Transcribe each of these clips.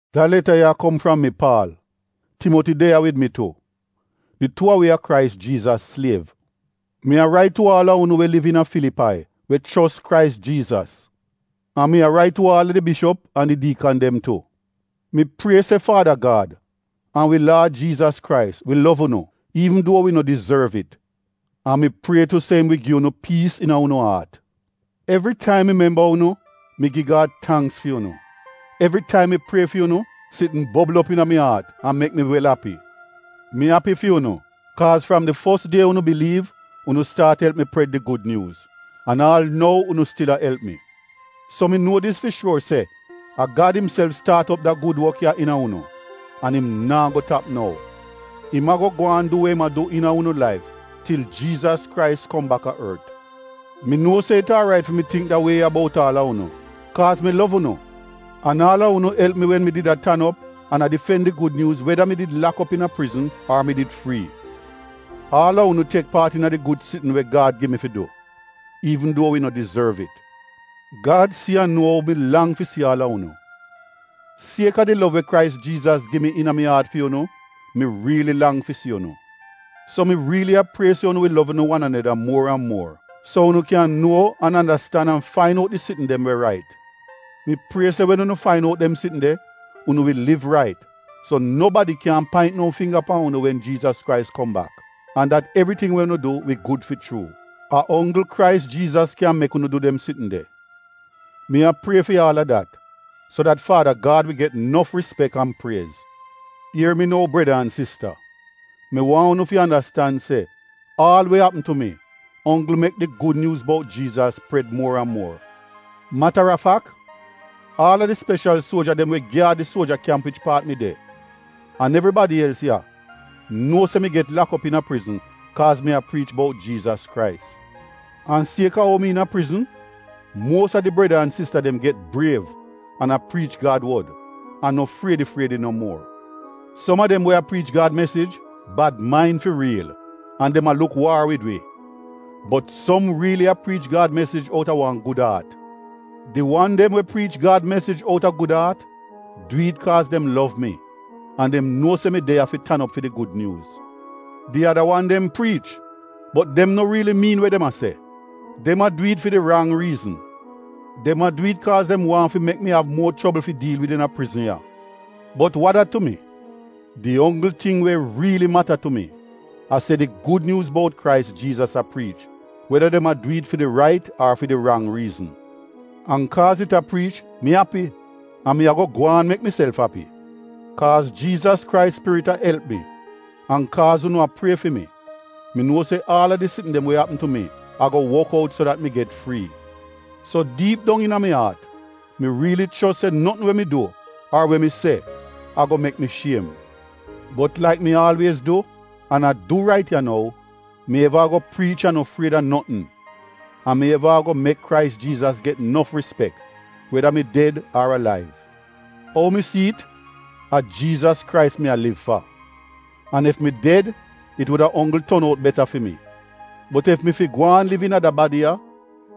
Da leta ya a kom fram mi, Paal. Timoti de ya wid mi tu. Di tuu a wi a Krais Jiizas sliev. Mi a rait tu aal a unu we liv iina Filipai we chos Krais Jiizas. An mi a rait tu aal a di bishop an di diikan dem tu. Mi prie se Faada Gad, an wi Laad Jiizas Krais wi lov unu, iivn duo wi no dizorv it. An mi prie tu se im wi gi unu piis iina unu aat. Evritaim mi memba unu, mi gi Gad tangks fi unu. Evritaim mi prie fi unu, sitn bobl op iina mi aat an mek mi wel api. Mi api fi unu, kaaz fram di fos die unu biliiv unu staat elp mi pred di Gud Nyuuz, an aal nou unu stil a elp mi. So mi nuo dis fi shuor se a Gad imself staat op da gud wok ya iina unu, an im naa go tap nou. Im a-go gwaan du we im a du iina unu laif, til Jiizas Krais kom baka ort. Mi nuo se it aarait fi mi tingk da wie ya bout aal a unu, kaaz mi lov unu an aal a unu elp mi wen mi did a tan op an a difen di Gud Nyuuz, weda mi did lak op iina prizn ar mi did frii. Aal a unu tek paat iina di gud sitn we Gad gi mi fi du, iivn duo wi no dizorv it. Gad si an nuo ou mi lang fi si aal a unu. Siek-a di lov we Krais Jiizas gi mi iina mi aat fi unu, mi riili lang fi si unu. So mi riili a prie se unu wi lov unu wan aneda muor an muor, so unu kyan nuo an andastan an fain out di sitn dem we rait. Mi prie se wen unu fain out dem sitn de unu wi liv rait so nobadi kyaahn paint no fingga pan unu wen Krais Jiizas kom bak, an dat evriting we unu du wi gud fi chuu — a onggl Krais Jiizas kyan mek unu du dem sitn de. Mi a prie fi aal a dat so dat Faada Gad wi get nof rispek an priez. Ier mi nou breda an sista, mi waahn unu fi andastan se aal we apm tu mi onggl mek di Gud Nyuuz bout Jiizas pred muor an muor. Matarafak aal a di speshal suoja dem we gyaad di suoja kyamp wich paat mi de an evribadi els ya nuo se mi get lak op iina prizn kaaz mi a priich bout Jiizas Krais. An siek-a ou mi iina prizn, muos a di breda an sista dem get briev an a priich Gad wod, an no friedi-friedi no muor. Som a dem we a priich Gad mesij bad main fi riil an dem a luk waar wid wi. Bot som riili a priich Gad mesij outa wan gud aat. Di wan dem we priich Gad mesij outa gud aat, du it kaaz dem lov mi an dem nuo se mi de ya fi tan op fi di Gud Nyuuz. Di ada wan dem priich, bot dem no riili miin we dem a se, dem a du it fi di rang riizn. Dem a du it kaaz dem waahn fi mek mi av muo chobl fi diil wid iina prizn ya. Bot wa dat tu mi? Di onggl ting we riili mata tu mi a se di Gud Nyuuz bout Krais Jiizas a priich weda dem a du it fi di rait ar fi di rang riizn. An kaaz it a priich, mi api, an mi a-go gwaan mek miself api. Kaaz Jiizas Krais Spirit a elp mi, an kaaz unu a prie fi mi, mi nuo se aal a di sitn dem we apm tu mi a-go wok out so dat mi get frii. So diip dong iina mi aat, mi riili chos se notn we mi du ar we mi se a-go mek mi shiem. Bot laik mi aalwiez du, an a du rait ya nou, mi eva a-go priich an no fried a notn, an mi eva a-go mek Krais Jiizas get nof rispek, weda mi ded ar alaiv. Ou mi si it, a Jiizas Krais mi a liv fa. An ef mi ded, it wuda onggl ton out beta fi mi. Bot ef mi fi gwaan liv iina da badi ya,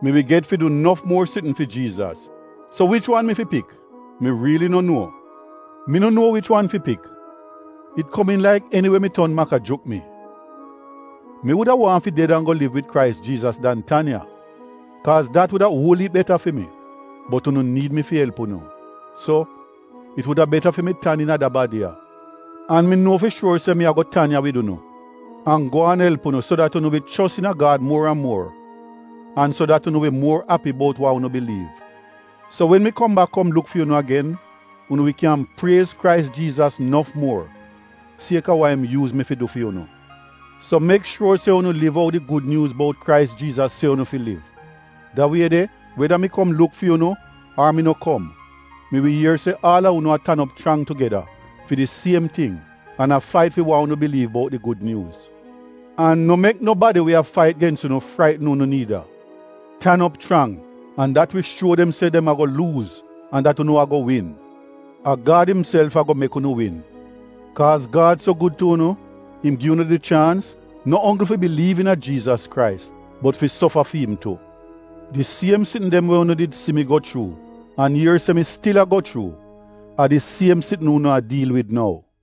mi wi get fi du nof muor sitn fi Jiizas. So wich wan mi fi pik? Mi riili no nuo. Mi no nuo wich wan fi pik. It komiin laik eniwe mi ton maka juk mi. Mi wuda waahn fi ded an go liv wid Krais Jiizas dan tan ya, kaaz dat wuda uol iip beta fi mi. Bot unu niid mi fi elp unu. So, it wuda beta fi mi tan iina da badi ya. An mi nuo fi shuor se mi a-go tan ya wid unu an gwaan elp unu so dat unu wi chos iina Gad muor an muor, an so dat unu wi muor api bout wa unu biliiv. So wen mi kom bak kom luk fi unu agen, unu wi kyan priez Krais Jiizas nof muor, siek-a wa im yuuz mi fi du fi unu. So mek shuor se unu liv ou di Gud Nyuuz bout Krais Jiizas se unu fi liv. Da wie de weda mi kom luk fi unu, ar mi no kom, mi wi ier se aal a unu a tan op chrang tugeda fi di siem ting an a fait fi wa unu biliiv bout di Gud Nyuuz. An no mek nobadi we a fait gens unu fraitn unu niida. Tan op chrang an dat wi shuo dem se dem a-go luuz an dat unu a-go win. A Gad imself a-go mek unu win. Kaaz Gad so gud tu unu, im gi unu di chaans, no onggl fi biliiv iina Jiizas Krais bot fi sofa fi im tu. Di siem sitn dem we unu did si mi go chuu an ier se mi stil a-go chuu, a di siem sitn unu a diil wid nou.